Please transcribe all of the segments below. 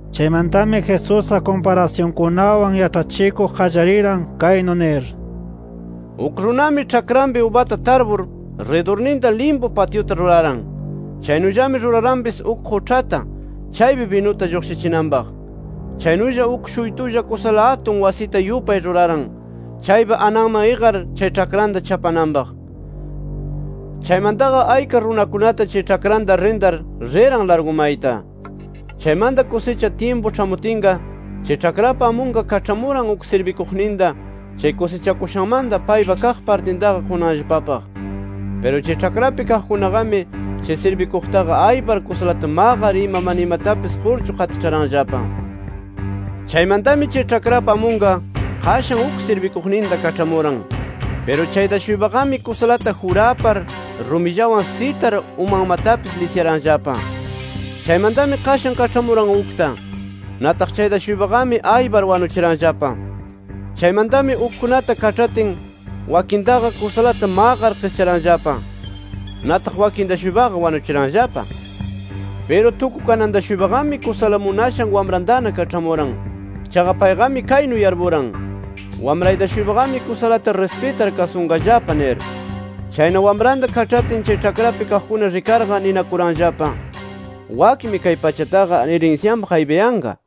Chaymantami Jesusqa kumparasyunkunawan yaĉhachikuq qallariran, kaynu nir: “Uk runami ĉhakranpi ubata tarpur, ridurninta limpu patyuta ruraran. Chaynullami ruraranpis uk quĉhata chaypi binuta lluqshichinanpaq. Chaynulla uk shuytulla kusala atun wasita yupay ruraran, chaypa ananman iqar chay ĉhakranta chapananpaq. Chaymantaqa ayka runakunata chay ĉhakranta arrintar riran largu mayta. Chaymanta kusicha tyimpu ĉhamutinqa, chay ĉhakrapa amunqa kaĉhamuran uk sirbikuqninta, chay kusichakushanmanta paypaq kaq partintaqa qunanllapapaq. Piru chay ĉhakrapi kaqkunaqami chay sirbikuqtaqa aypar kusalata maqar ima, mana imatapis qurchu qatiĉharanllapa. Chaymantami chay ĉhakrapa amunqa qashan uk sirbikuqninta kaĉhamuran. Piru chayta-shuypaqami kusalata jurapar, [rumillawan sitar] umanmatapis lisyaranllapa. Chaymantami qashan kaĉhamuran ukta. Nataq chayta-shuypaqami aypar wanuchiranllapa. Chaymantami ukkunata kaĉhatin, wakintaqa kusalata maqar qischaranllapa. Nataq wakinta-shuypaqa wanuchiranllapa. “Piru tukukananta-shuypaqami kusala munashan wamrantana kaĉhamuran. Chaqa payqami kaynu yarpuran: ‘Wamrayta-shuypaqami kusalata rispitar kasunqallapa’ nir. Chayna wamranta kaĉhatin, chay ĉhakrapi kaqkuna rikarqa, ninakuranllapa: ‘Wakmi kay pachataqa irinsyanpaq aypayanqa.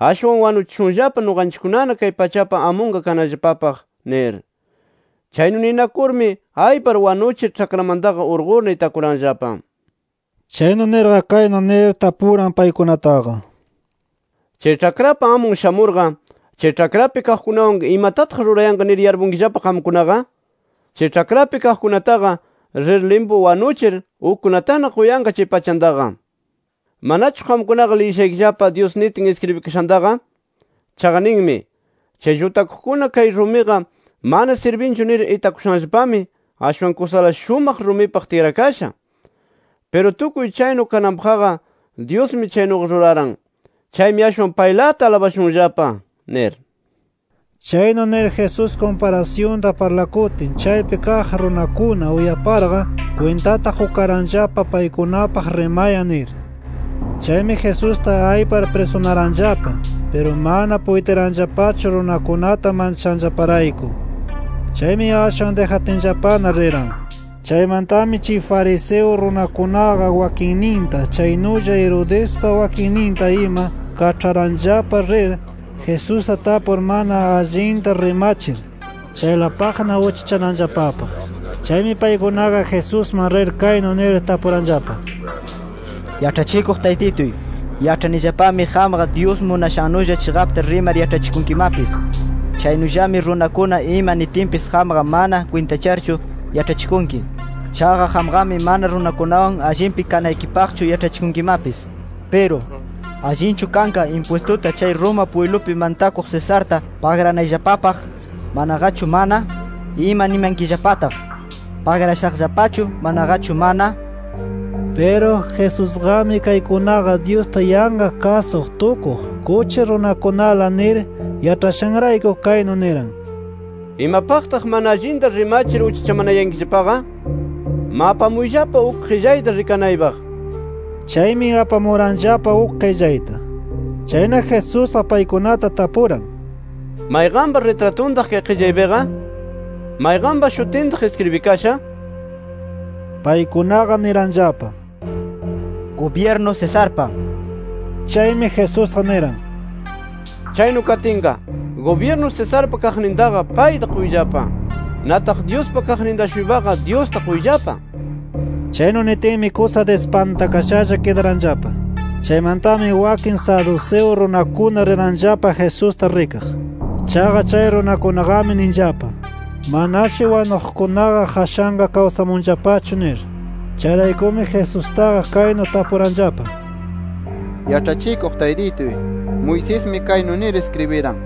¡Ashwan wanuchishunllapa nuqanchikkunana kay pachapa amunkunaqa kanallapapaq!’ nir. Chaynu ninakurmi aypar wanuchir, ĉhakramantaqa urqurna itakuranllapa”. Chaynu nirqa kaynu nir tapukuran paykunataqa: “¿Chay ĉhakrapa amun shamurqa, chay ĉhakrapi kaqkunawanqa imatataq rurayanqa nir yarpunkillapa qamkunaqa? Chay ĉhakrapi kaqkunataqa rir limpu wanuchir ukkunatana quyanqa chay pachantaqa. ¿Manachu qamkunaqa liyishaykillapa, Dyus nitin iskribikashantaqa? Chaqa ninmi: ‘Chay llutakuqkuna kay rumiqa mana sirbinchu nir itakushanllapami, ashwan kusala shumaq rumipaq tikrakasha. Piru tukuy chaynu kananpaqqa Dyusmi chaynuqa ruraran. Chaymi ashwan paylata alabashunllapa’ nir”. Chaynu nir Jesús kumparasyunta parlakutin chaypi kaq runakuna uyaparqa, kwintata qukaranllapa paykunapaq rimayan nir. Chaymi Jesusta aypar prisunaranllapa. Piru mana puytiranllapachu runakunata manchashanllaparayku. Chaymi ashwan dijatinllapana riran. Chaymantami chay fariseo runakunaqa wakinninta chaynulla Herodespa wakinninta ima kaĉharanllapa rir, Jesusta tapur mana allinta rimachir, chaylapaqna uchachananllapapaq. Chaymi paykunaqa Jesusman rir kaynu nir tapuranllapa: —Yaĉhachikuq Taytituy, yaĉhanillapami qamqa Dyus munashannulla chiqapta rimar yaĉhachikunkimapis. Chaynullami runakuna ima nitinpis qamqa mana kwintacharchu yaĉhachikunki. Chaqa qamqami mana runakunawan allinpi kanaykipaqchu yaĉhachikunkimapis. Piru, ¿allinchu kanqa impwistuta chay Roma pwiblupi mantakuq Cesarta, pagranayllapapaq, manaqachu mana? Ima nimankillapataq, ¿pagrashaqllapachu manaqachu mana? nir. Piru Jesusqami kaykunaqa Dyusta yanqa kasuq tukuq, kuchi runakunala nir yaĉhayashanrayku, kaynu niran: —¿Imapaqtaq mana allinta rimachir uchachamanayankillapaqa? Ma, apamuyllapa uk qillayta rikanaypaq nir. Chaymi apamuranllapa uk qillayta. Chayna Jesusqa paykunata tapuran: —¿Mayqanpa ritratuntaq kay qillaypiqa? ¿Mayqanpa shutintaq iskribikasha? nir. Paykunaqa niranllapa: —Gubyirnu Cesarpa nir. Chaymi Jesusqa niran: —Chaynu katinqa, gubyirnu Cesarpa kaqnintaqa payta quyllapa. Nataq Dyuspa kaqninta-shuypaqa Dyusta quyllapa nir. Chaynu nitinmi kusa dispantakashalla kidaranllapa. Chaymantami wakin saduceo runakuna riranllapa Jesusta rikaq. Chaqa chay runakunaqami ninllapa: “Manashi wanuqkunaqa qashanqa kawsamunllapachu” nir. Chayraykumi Jesustaqa kaynu tapuranllapa: —Yaĉhachikuq Taytituy, Moisesmi kaynu nir iskribiran: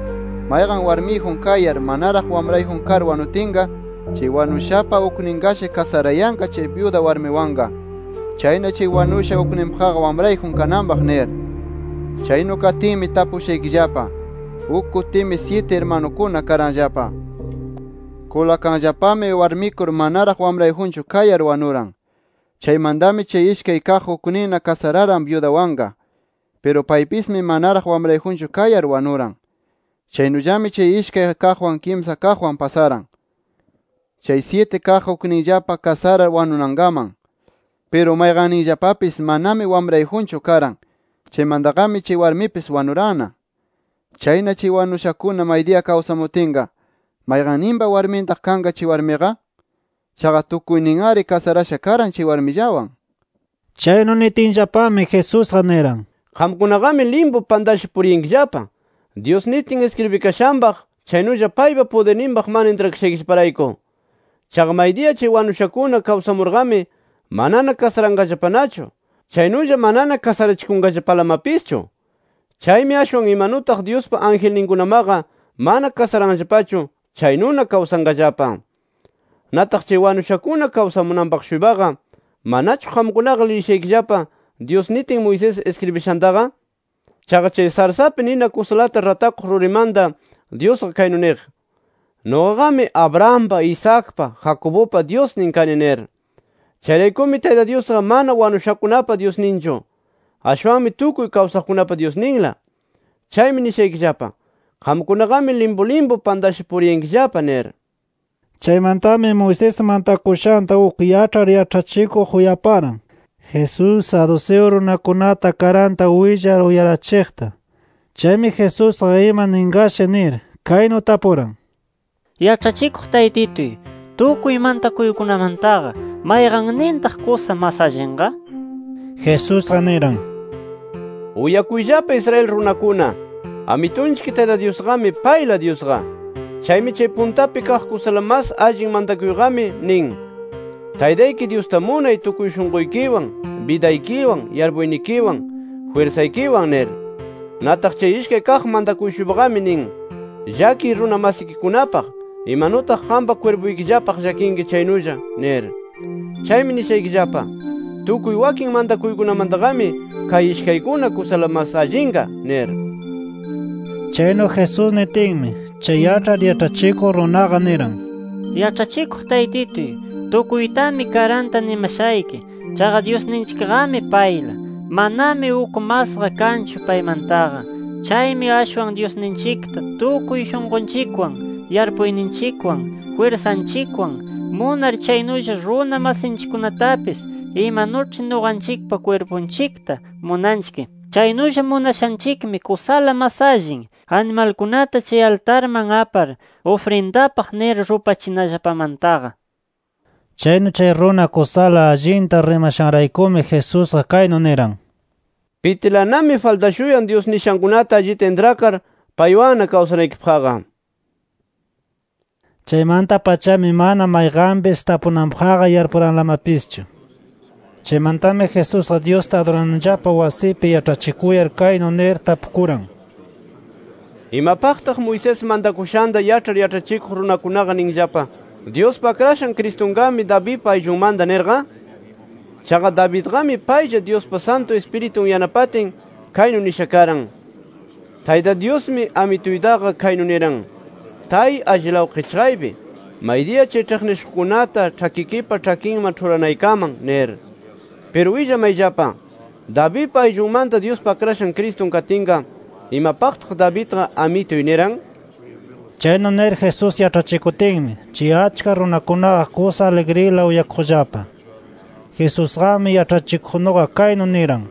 ‘Mayqan warmiyjun kayar, manaraq wamrayjun kar wanutinqa, chay wanushapa ukninnashi kasarayanqa chay byuda warmiwanqa. Chayna chay wanusha ukninpaqqa wamrayjun kananpaq’ nir. Chaynu katinmi tapushaykillapa, uk kutimi syiti irmanukuna karanllapa. Kulakanllapami, warmikur manaraq wamrayjunchu kayar wanuran. Chaymantami chay ishkay kaq ukninna kasararan byudawanqa. Piru paypismi manaraq wamrayjunchu kayar wanuran. Chaynullami chay ishkay kaqwan, kimsa kaqwan pasaran, chay syiti kaq ukninllapa kasarar wanunankaman. Piru mayqanninllapapis manami wamrayjunchu karan. Chaymantaqami chay warmipis wanuranna. Chayna chay wanushakuna maydiya kawsamutinqa, ¿mayqanninpa warmintaq kanqa chay warmiqa? Chaqa tukuynin-ari kasarasha karan chay warmillawan. Chaynu nitinllapami, Jesusqa niran: —Qamkunaqami limpu pantasha puriyankillapa, Dyus nitin iskribikashanpaq, chaynulla paypa pudirninpaq mana intrakashaykillaparayku. Chaqa maydiya chay wanushakuna kawsamurqami, manana kasaranqallapanachu, chaynulla manana kasarachikunqallapalamapischu. Chaymi ashwan imanutaq Dyuspa angelninkunamaqa mana kasaranllapachu chaynuna kawsanqallapa. Nataq chay wanushakuna kawsamuqpaq-shuypaqa, ¿manachu qamkunaqa liyishaykillapa Dyus nitin Moisés iskribishantaqa? Chaqa chay sarsapi nina kusalata ratakuq rurimanta Dyusqa kaynu niq: ‘Nuqaqami Abrahampa, Isaacpa, Jacobupa Dyusnin kani’ nir. Chayraykumi Tayta Dyusqa mana wanushakunapa Dyusninchu; ashwanmi tukuy kawsaqkunapa Dyusninla. Chaymi nishaykillapa: Qamkunaqami limpu limpu pantasha puriyankillapa nir. Chaymantami Moisés mantakushanta uk yaĉhar yaĉhachikuq uyaparan Jesús, saduceo runakunata karanta willar uyarachiqta. Chaymi Jesusqa ima ninqashi nir, kaynu tapuran: —Yaĉhachikuq Taytituy, ¿tukuy mantakuykunamantaqa mayqannintaq kusa mas allinqa? nir. Jesusqa niran: —¡UYAKUYLLAPA ISRAEL RUNAKUNA! AMITUNCHIK TAYTA DYUSQAMI, PAYLA DYUSQA. Chaymi chay puntapi kaq kusala mas allin mantakuyqami nin: ‘Taytayki Dyusta munay tukuy shunquykiwan, bidaykiwan, yarpuynikiwan, jwirsaykiwan’ nir. Nataq chay ishkay kaq mantakuy-shuypaqami nin: ‘Llakiy runa masikikunapaq, imanutaq qampa kwirpuykillapaq llakinki chaynulla’ nir. Chaymi nishaykillapa: Tukuy wakin mantakuykunamantaqami kay ishkaykuna, kusala mas allinqa nir. Chaynu Jesús nitinmi, chay yaĉhar yaĉhachikuq runaqa, niran: —Yaĉhachikuq Taytituy, tukuytami karanta nimashayki. Chaqa Dyusninchikqami payla. Manami uk masqa kanchu paymantaqa. Chaymi ashwan Dyusninchikta tukuy shunqunchikwan, yarpuyninchikwan, jwirsanchikwan munar chaynulla runa masinchikkunatapis imanuĉhi nuqanchikpa kwirpunchikta munanchik chaynulla munashanchikmi kusala mas allin, animalkunata chay altarman apar ufrindapaq nir rupachinallapamantaqa nir. Chaynu chay runa kusala allinta rimashanraykumi Jesusqa kaynu niran: —Pitilanami faltashuyan Dyus nishankunata allita intrakar paywanna kawsanaykipaqqa nir. Chaymanta-pachami mana mayqanpis tapunanpaqqa yarpuranlamapischu. Chaymantami Jesusqa Dyusta adurananllapa wasipi yaĉhachikuyar kaynu nir tapukuran: “¿Imapaqtaq Moisés mantakushanta yaĉhar yaĉhachikuq runakunaqa ninllapa ‘Dyuspa Akrashan Cristunqami Davidpa ayllunmanta’ nirqa? Chaqa, Davidqami paylla Dyuspa Santu Ispiritun yanapatin, kaynu nisha karan: ‘Tayta Dyusmi, Amituytaqa kaynu niran: Tay allilaw qichqaypi, maydiya chay ĉhiqnishuqkunata ĉhakikipa ĉhakinman ĉhuranaykaman’ nir. Piru willamayllapa: Davidpa ayllunmanta Dyuspa Akrashan Cristun katinqa, ¿imapaqtaq Davidqa ‘Amituy’ niran?” Chaynu nir Jesús yaĉhachikutinmi, chay achka runakunaqa kusa aligrila uyakuqllapa. Jesusqami yaĉhachikuqnuqa kaynu niran: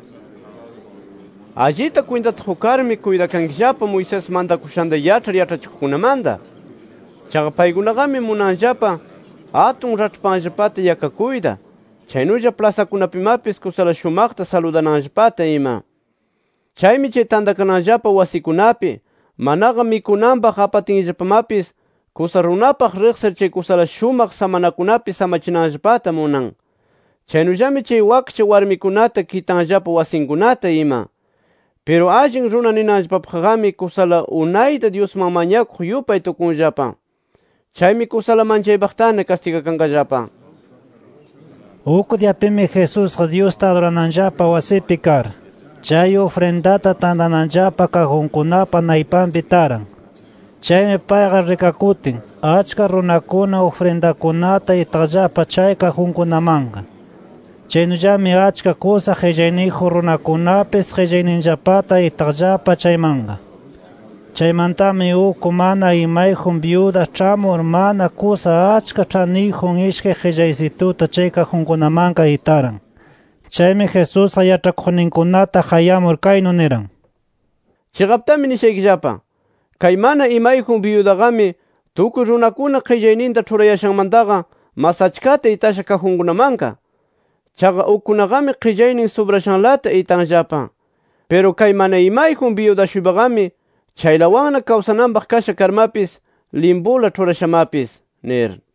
“Allita kwintata qukarmi, kuytakankillapa Moisés mantakushanta yaĉhar yaĉhachikuqkunamanta. Chaqa paykunaqami munanllapa atun raĉhpanllapata yakakuyta, chaynulla plasakunapimapis kusala shumaqta saludananllapata ima. Chaymi chay tantakananllapa wasikunapi manaqa mikunanpaq apatinllapamapis, kusa runapaq riqsir chay kusala shumaq samanakunapi samachinanllapata munan. Chaynullami chay wakcha warmikunata kitanllapa wasinkunata ima. Piru allin runa ninanllapapaqqami kusala unayta Dyusman mañakuq yupay tukunllapa. Chaymi kusala manchaypaqtana kastigakanqallapa”. Uk diyapimi Jesusqa Dyusta adurananllapa wasipi kar, chay ufrindata tantananllapa kajunkunapa naypanpi taran. Chaymi payqa rikakutin, achka runakuna ufrindankunata itaqllapa chay kajunkunamanqa. Chaynullami achka kusa qillayniyjun runakunapis qillayninllapata itaqllapa chaymanqa. Chaymantami uk mana imayjun byuda ĉhamur, mana kusa achka ĉhaniyjun ishkay qillaysituta chay kajunkunamanqa itaran. Chaymi Jesusqa yaĉhakuqninkunata qayamur kaynu niran: —Chiqaptami nishaykillapa: Kay mana imayjun byudaqami tukuy runakuna qillayninta ĉhurayashanmantaqa mas achkata itasha kajunkunamanqa. Chaqa ukkunaqami qillaynin subrashanlata itanllapa. Piru kay mana imayjun byuda-shuypaqami, chaylawanna kawsananpaq kasha karmapis limpula ĉhurashamapis, nir.